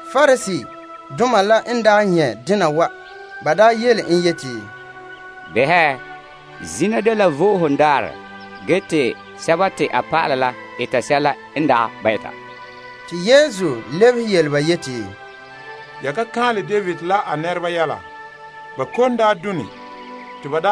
Pariseedoma la n daa nyɛ' dena wa, ba yele en yeti, Behɛ, zina dela Vo'ohogo Daarɛ ge te a dɔlɔba la eta sɛla n dagɛ ba eta. Te a lebehe yele ba yeti, Ya ka kaanlɛ David la a nɛreba yɛla ba kom n daa done te ba?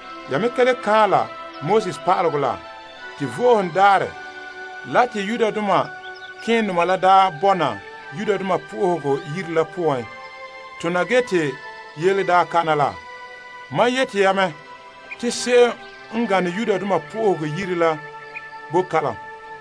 Ya me ka le kaanlɛ Pa'alegɔ la te Vo'ohogo Daarɛ la te malemadoma la daa bɔna Yenɛ Yire la poan tona ge te yele daa kana la? Mam yeti ya me te se'em n gane Yenɛ Yire la boe kalom.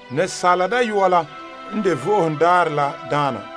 Asaala Dayɔa la n de Vo'ohogo Daarɛ la Daana.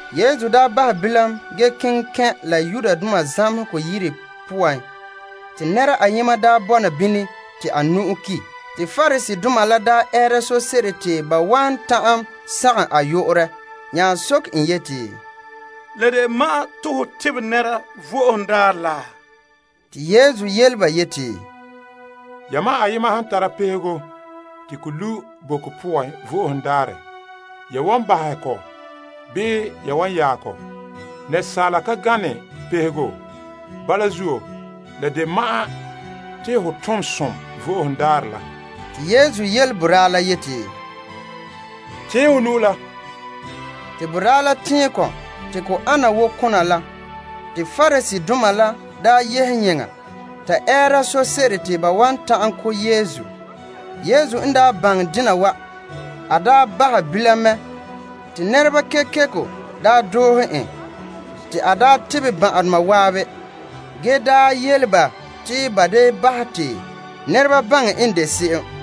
Yesu daa bahɛ bilam ge keŋɛ kɛn' la ba zamehegɔ yire poan, te nɛra ayema daa bɔna bini te a nu'o ki'. Te Pariseedoma la daa ɛɛra sose'ere te ba wan ta'an sagom a yu'urɛ nya soke en yeti, La de ma'an te ho tebɛ nɛra Vo'ohogo Daarɛ la? Te Yesu yele ba yeti, Yamam ayema han tara pehego te ko lu' boko poan Vo'ohogo Daarɛ, ya wan bahɛ kɔ bii ya wan vaɛ kɔ? Asaala ka gane pehego? Bala zuo, la de ma'an te ho tom som Vo'ohogo Daarɛ la. Te a yele boraa la yeti, Tɛɛn ho nu'o la. Te boraa la tɛɛn kɔ te ko le ana wo kona la. Te Pariseedoma la daa yehe yeŋa ta ɛɛra sose'ere te ba wan ta'an ko' Yesu. Yesu n daa baŋɛ dena wa, a bahɛ bilam mɛ, te nɛreba kekeko doohe en te a tebɛ ba ban'ahedoma zan'an, yele ba te ba da bahɛ te nɛreba baŋɛ en de se'em.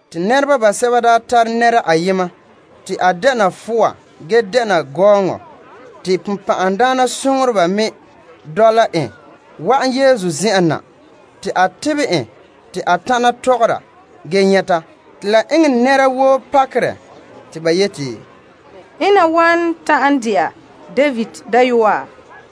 Te nɛreba basɛba daa tare nɛra ayema te a dɛna fowa ge dɛna gɔɔŋɔ te bonbɛ'ɛhe me dɔla en wa'an Yesu zen'an na. Te a tebɛ en te a tana tɔgɔra ge nyɛta. Te la eŋɛ nɛra woo pakerɛ te ba yeti, Ena wan ta'an de'a David Dayɔa?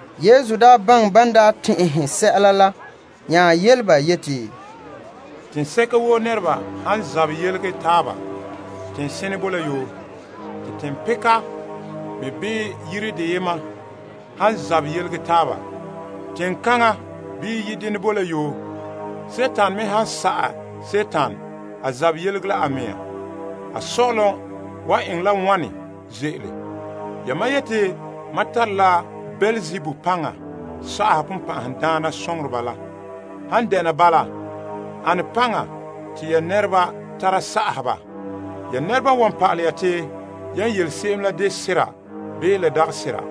Yesu baŋɛ ban daa tɛn'ɛhe sɛla la nya yele ba yeti, Teŋsɛka woo nɛreba han zabɛ yelege taaba teŋsene boe la yoo. Te teŋpeka me bii yire deyema han zabɛ yelege taaba ka ze'ele. Dima me han sa'ɛ Dima a zabɛ yelege la a mea. A sɔ'ɔlom wan eŋɛ la wane ze'ele? Yamam yeti mam tare la Beelzebul paŋa sa'aha bonbɛ'ɛhe. La han dena bala, ane paŋa te ya nɛreba tara sa'aha ba? Ya nɛreba n wan pa'alɛ ya te yan yele se'em la de sera bii la dagɛ sera.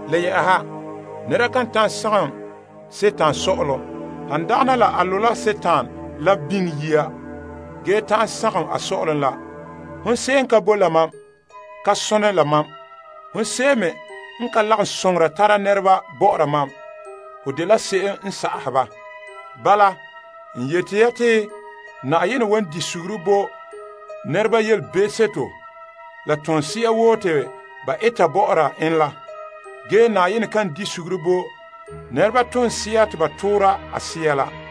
Le yɛ'ɛha, nɛra kan ta'an sagom paŋadaana sɔ'ɔlom, han dagana a lo' la paŋadaana la biŋe yia, ge ta'an sagom a sɔ'ɔlom la. Hon se'em n ka boe la mam, ka sone la mam. Hon se'em me n ka lagom soŋora tara nɛreba bɔ'ɔra mam, ho dela se'em sa'ahɛ ba. Bala n yeti ya te Yenɛ wan bahɛ nɛreba be'em la ba toora woo bo ba. Ge Yenɛ kan bahɛ nɛreba be'em te ba toora a Sea la bo ba.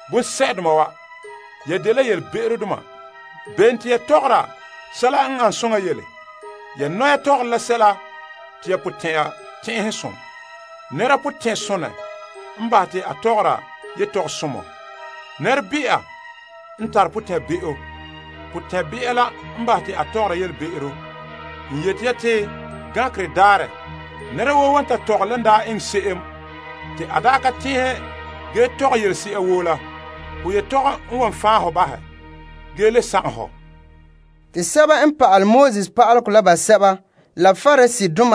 Bonsɛ'doma wa! Ya dela be'emdoma. Bene to ya tɔgɔra sɛla n an soŋa yele? Ya nɔya tɔgɔre la sɛla te ya potɛn'ɛra tɛnsonɛ. Nɛrasomɔ potɛn'sonɛ n bahɛ te a tɔgɔra yetɔgɔsomɔ. Nɛrebe'a potɛn'be'a la n bahɛ te a tɔgɔra yetɔgɔbe'ero. N yeti ya te gankerɛ daarɛ, nɛra woo wan ta tɔgɛ lan daa eŋɛ se'em te a daa ka tɛn'ɛhe ge tɔgɛ yelese'a woo la. Ho yetɔgom n wan fan' hɔ bahɛ ge ho yetɔgom wan le sagom hɔ. Te Pariseedoma basɛba la sɛba n pa'ale Pa'alegɔ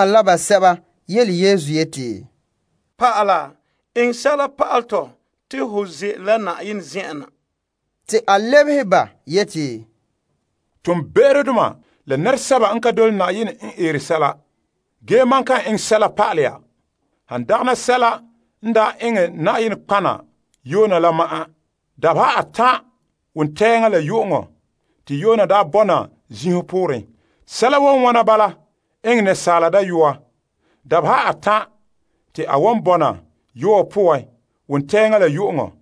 la basɛba la yele en yeti, Pa'ala, eŋɛ sɛla pa'alɛ tɔ te ho ze'ele Na'ayenɛ na. Te a lebehe yele ba yeti, Toonbe'erodoma la nɛresɛba n ka dole Na'ayenɛ n eere sɛla la. Ge mam kan enŋ sɛla pa'alɛ ya, han dagana sɛla n daa eŋɛ nɔtɔgɔha Yona la ma'an. Dabeha atan', wontɛɛŋa la yu'uŋɔ te Yona daa bɔna zinho kantɛ pooren. Sɛla wan wɔna bala enŋɛ Asaala Dayɔa. Dabeha atan' te a wan bɔna yɔɔ poan, wontɛɛŋa la yu'uŋɔ.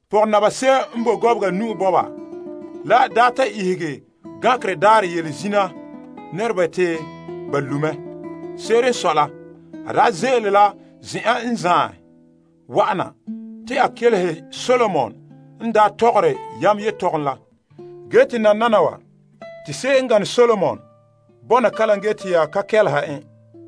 Pɔgɔnaba se'em n boe Gɔbega Nu'o Bɔba la wan ta ihege gankerɛ daarɛ yele zina nɛreba te ba lu' mɛ. Se'ere n sɔe la, a daa ze'ele la zen'an zaen wa'ana, te a kelehe Solomon n daa tɔgɔre yam yetɔgom la ge te nananawa te se'em n gane Solomon bɔna kalam ge te ya ka kɛleha en.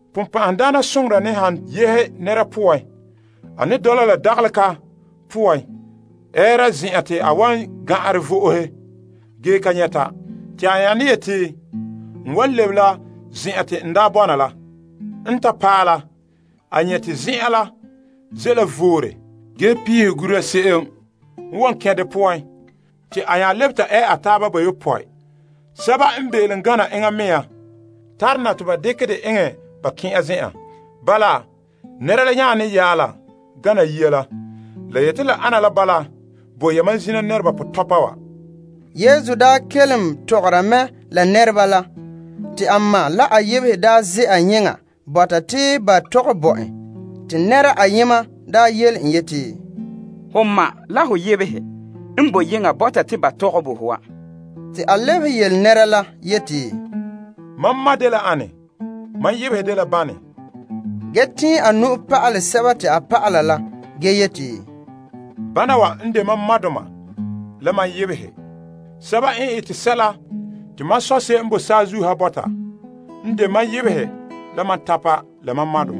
Bonbe'a ne han yehe nɛra poan, a ne dɔla la dagale ka poan ɛɛra zen'an te a wan gan'anrɛ vo'ohe ge ka nyɛta. Te a nya ne yeti, a wan lebe la zen'an te a daa bɔna la. En ta paɛ la, a nyɛ' te zen'an la ze' la voore ge piihɛ gura se'em n wan kɛn' de poan. Te a lebe ta ɛ a taaba bayopɔe sɛba n be'elom gana enŋa mea tare na te ba dekɛ dɛ eŋɛ ba kɛn' a zen'an. Bala, nɛra la yaane yaala gana yia la. La yeti la ana la bala bo zina nɛreba pɔtɔpa wa. Yesu n daa kelom tɔgɔra la nɛrekooŋɔ la, a ma la a yebehe daa ze'a yeŋa bɔta te ba tɔgɛ bo en. Te nɛra ayema yele en yeti, Ho ma la ho yebehe n boe yeŋa bɔta te ba tɔgɛ bo ho wa. Te a lebehe la yeti, Mam ma dela ane? Mam yebehe dela bane? Ge te a tɛɛn nu'o pa'alɛ a dɔlɔba la ge yeti, Bana wa n de mam madoma la mam yebehe. Sɛba n ete sɛla te mam Sɔ' n boe saazuo ha bɔta n de mam yebega la mam tanya la mam ma.